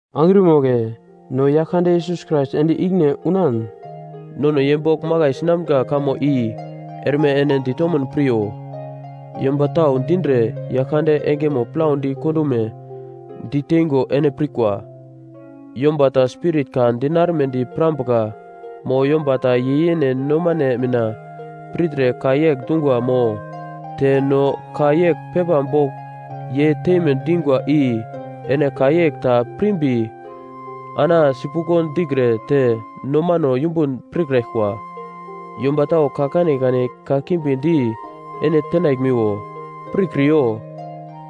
Angrima wagle no Yaglkande Yesus Krais ende ikine unan nono ye bogl makai sinamga kamo i erme ene ditomun piryo. Yomba tau dindre Yaglkande engemo plaudi kondume diteingo ene pirkwa. Yomba ta spirit ka dinarumedi pirambuka mo yomba ta ye yene nomane mina pirtre ka yegl dungwa mo te no ka yegl pepa bogl ye teime dingwa i ene ka yegl ta pirmbi ana sipuglo dikre te nomano yumbun pirkraglkwa. Yomba tau ka kanekane kakimbi di ene tenaglmiwo, pirkriyo.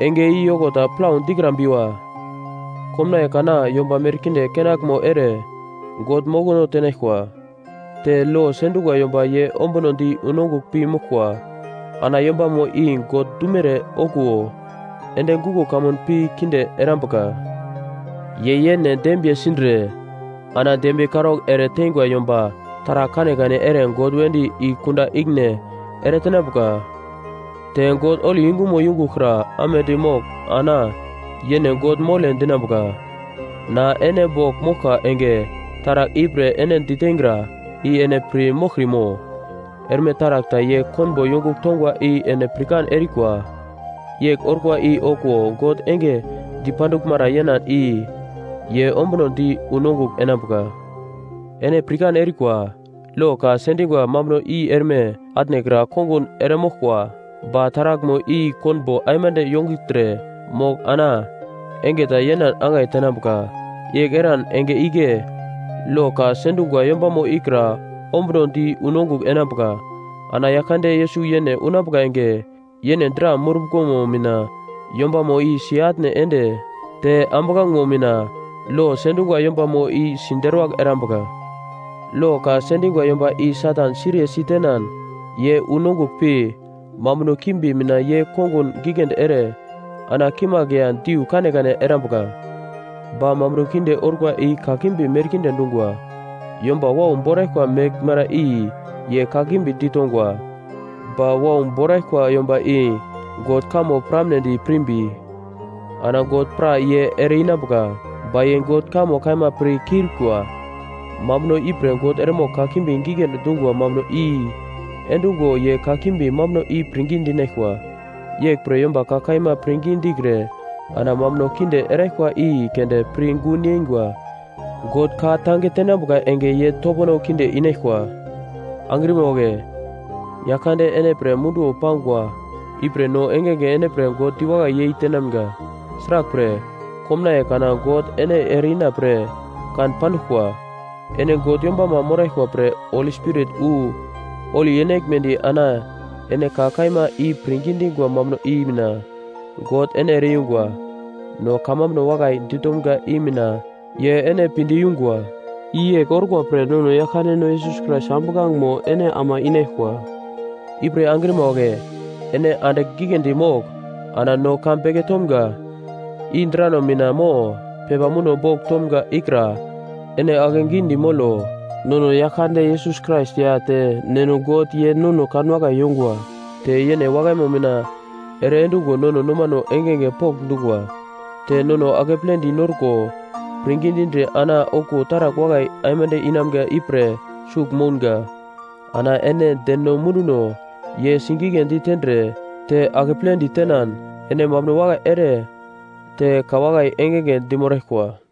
Enge i yoko ta plau dikrambiwa. Komnaiye kana yomba merkinde kenaglme ere God mokono tenaglkwa. Te lo sendungwa yomba ye ombunodi unongugl pi moglkwa, ana yombamo i God dumere okuwo ende guglo kamun pi kinde erambuka. Ye yene dembiye sindre ana dembiye karaugl ere teingwa yomba taragl kanekane ere God wedi i kunda ikine eretenambuka. Te God holi yungumo yungugl kra amedi mogl ana yene God mole dinambuka. Na ene bogl moglka enge taragl ipre ene ditengra i ene pir moglkrimo? Erme taragl ta ye konbo yongugl tongwa i ene pirkan erikwa. Yegl orkwa i okuwo God enge dipanduglmara yenan i ye ombunodi unongugl enambuka. Ene pirkan erikwa, lo ka sendingwa mambuno i erme atnekra kongun eremoglkwa. Ba taraglmo i konbo aimande yongugltre mogl ana enge ta yenan angai tenambuka. Yegl eran enge igle lo ka sendungwa yombamo ikra ombunodi unongugl enambuka. Ana Yaglkande Yesus yene unambuka enge, yene dra murumbuglomo mina yombamo i si-atne ende te ambuglangemo mina lo sendungwa yombamo i siderwagl erambuka. Lo ka sendingwa yomba i Satan siriye sitenan ye unongugl pi, mambuno kimbi mina ye kongun giglendi ere ana kimagl ya diu kanekane erambuka. Ba mambuno kinde orkwa i kakimbi merkinde dungwa. Yomba wau boraglkwa meglmara i ye kakimbi ditongwa. Ba wau boraglkwa yomba i God kamo piramnedi pirmbi, ana God pra ye ere-inambuka, ba ye God kamo kaima pir kiurikwa. Mambuno ipre God eremogl kakimbi giglendi dungwa mambuno i-endungo ye kakimbi mambuno i pirngi dinaglkwa. Yeglpre yomba ka kaima pirngi dikre ana mambuno kinde eraglkwa i keunde pir gun yeingwa, God ka tange tenambuka enge ye topono kinde inaglkwa. Angrima wagle, Yaglkande ene pre munduwo pangwa ipre no engenge ene pre God diwakai yei tenamga, sraglpre, komnaiye kana God ene ere-ina pre kan panduglkwa. Ene God yombama moraglkwa pre Holi Spirit wu holi enaglmedi ana ene ka kaima i pirngi dingwa mambuno i mina God ene ere-yungwa. No kamambuno wakai ditomga i mina ye ene pinde yungwa. I yegl orkwa pre nono Yaglkandeno Yesus Krais ambuglangemo ene ama inaglkwa. Ipre angrima wagle ene andigl giglendi mogl ana no ka beke tomga, i drano mina mo pepa muno bogl tomga ikra ene akegidi molo. Nono Yaglkande Yesus Krais ya te Neno God ye nono kanwakai yongwa. Te yene wakaimo mina ere endungo nono nomano engenge pokndungwa. Te nono akepledi norko pirngi dindre ana okuwo taragl wakai aimande inamga ipre sugl mounga. Ana ene deno munduno ye sigigledi tendre te akepledi tenan ene mambuno wakai ere te ka wakai engenge dimoraglkwa.